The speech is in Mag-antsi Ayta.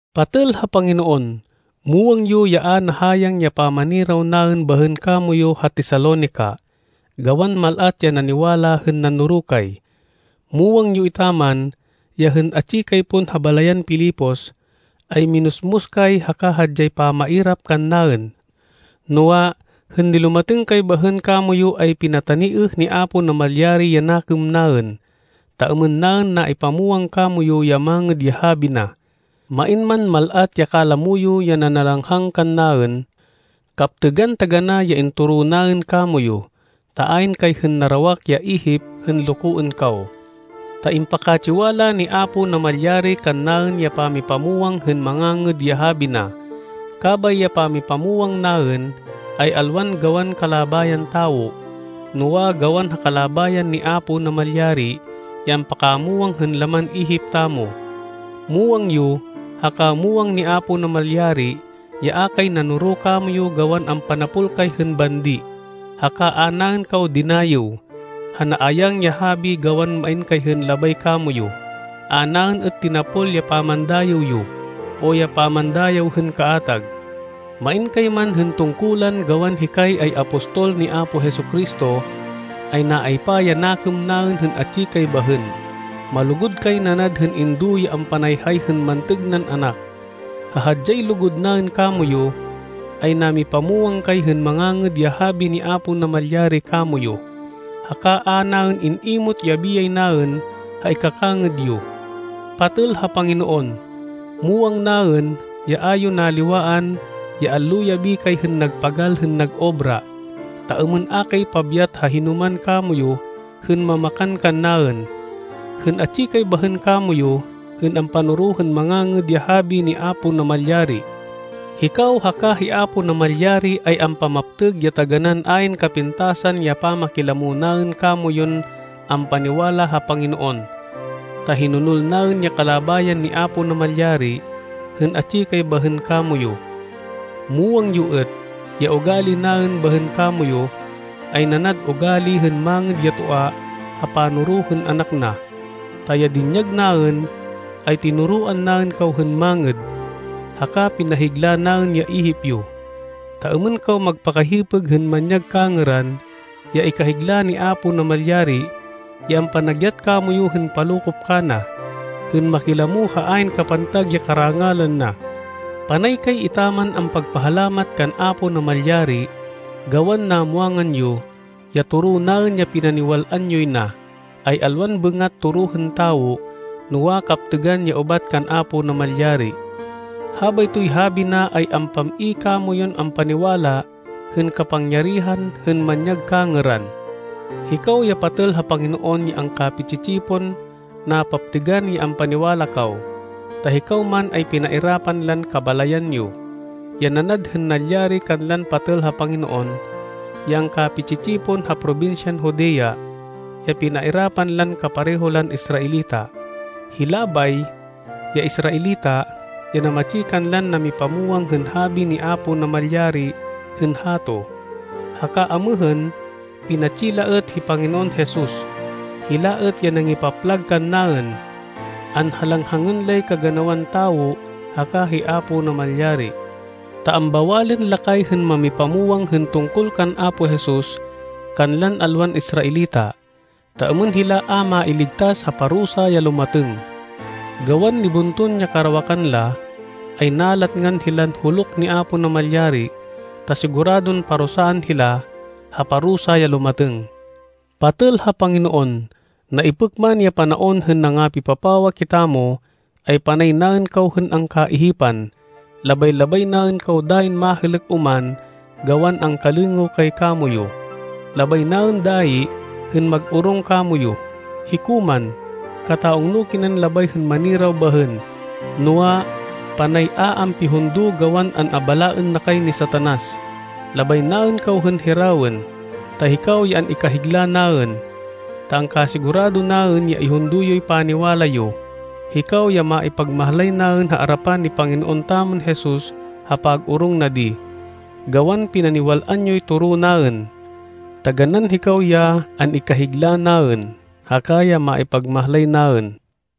Patêl ha Panginoon, muwang yo ya a nahayang ya pamaniraw naên bahên kamoyu ha Tesalonica, gawan mal-at ya naniwala hên nanoro kay. Muwang yo etaman ya hên atsi kay pon ha balayan Filipos, ay minusmus kay haka hadyay pamairap kannaên. Noa, hên nilumatêng kay bahên kamoyu ay pinataniêh ni Apo Namalyari ya nakêm naên, ta êmên naên naipamwang kamoyu ya Mangêd ya Habi na, main man mal-at ya kalamo yo ya nanalanghang kannaên. Kaptêgan taganá ya intoro naên kamoyu, ta ayn kay hên narawak ya ihip hên lokoên kaw. Ta impakatsiwala ni Apo Namalyari kannaên ya pamipamwang hên Mangangêd ya Habi na. Kabay ya pamipamwang naên ay alwan gawan kalabayan tawo, noa, gawan ha kalabayan ni Apo Namalyari ya ampakamwang hên laman ihip tamo. Muwang yo haka muwang ni Apo Namalyari ya a kay nanoro kamoyu gawan ampanapol kay hên bandi, haka a naên kaw dinayêw, ha naayang ya habi gawan main kay hên labay kamoyu. A naên êt tinapol ya pamandayêw yo, o ya pamandayêw hên kaatag. Main kay man hên tungkulan gawan hikay ay apostol ni Apo Jesu-Cristo, ay naaypa ya nakêm naên hên atsi kay bahên. Malugud kay nanad hên indo ya ampanayhay hên mantêg nan anak. Ha hadyay lugud naên kamoyu, ay namipamwang kay hên Mangangêd ya Habi ni Apo Namalyari kamoyu, haka a naên in-imot ya biyay naên ha ikakangêd yo. Patêl ha Panginoon, muwang naên ya a yo naliwaan, ya allo-yabi kay hên nagpagal hên nag-obra, ta êmên a kay pabyat ha hinoman kamoyu hên mamakan kannaên, hên atsi kay bahên kamoyu hên ampanoro hên Mangangêd ya Habi ni Apo Namalyari. Hikaw haka hi Apo Namalyari, ay ampamaptêg ya taganán ayn kapintasan ya pamakilamo naên kamoyun ampaniwala ha Panginoon, ta hinonol naên ya kalabayan ni Apo Namalyari hên atsi kay bahên kamoyu. Muwang yo êt ya ugali naên bahên kamoyu, ay nanad ugali hên mangêd ya toa ha panoro hên anak na. Ta ya dinyag naên, ay tinoroan naên kaw hên mangêd, haka pinahigla naên ya ihip yo, ta êmên kaw magpakahipêg hên manyag kangêran, ya ikahigla ni Apo Namalyari ya ampanagyat kamoyu hên palokop kana, hên makilamo ha ayn kapantag ya karangalan na. Panay kay etaman ampagpahalamat kan Apo Namalyari gawan namwangan yo, ya toro naên ya pinaniwal-an yoy na, ay alwan bêngat toro hên tawo, noa, kaptêgan ya ubat kan Apo Namalyari. Habaytoy habi na ay ampam-i kamoyun ampaniwala hên kapangyarihan hên manyag kangêran. Hikaw ya patêl ha Panginoon ya angkapi-tsi-tsipon, napaptêgan ya ampaniwala kaw, ta hikaw man ay pinairapan lan kabalayan yo, ya nanad hên nalyari kanlan patêl ha Panginoon, ya angkapi-tsi-tsipon ha probinsyan Judea, ya pinairapan lan kapareho lan Israelita. Hila bay, ya Israelita, ya namatsi kanlan namipamwang hên habi ni Apo Namalyari hên hato, haka amêhên pinatsi la êt hi Panginoon Jesus. Hila êt ya nangipaplag kannaên. Anhalanghangên lay kaganawan tawo haka hi Apo Namalyari. Ta ambawalên la kay hên mamipamwang hên tungkol kan Apo Jesus kanlan alwan Israelita, ta êmên hila a mailigtas ha parusa ya lumatêng. Gawan nibunton ya karawakan la, ay nalatngan hilan huluk ni Apo Namalyari ta siguradon parusaan hila ha parusa ya lumatêng. Patêl ha Panginoon, naipêk man ya panaon hên nangapipapawa kitamo, ay panay naên kaw hên angkaihipan. Labay-labay naên kaw dayin mahêlêk oman gawan angkalêngêw kay kamoyu. Labay naên dayi hên mag-orong kamoyu. Hiko man, kata-ungno kinan labay hên maniraw bahên, noa, panay a ampihundo gawan an-abalaên na kay ni Satanas. Labay naên kaw hên hirawên, ta hikaw ya an-ikahigla naên, ta angkasigurado naên ya ihundo yoy paniwala yo. Hikaw ya maipagmahlay naên ha arapan ni Panginoon tamon Jesus ha pag-orong na di, gawan pinaniwal-an yoy toro naên. Taganán hikaw ya an-ikahigla naên, haka ya maipagmahlay naên.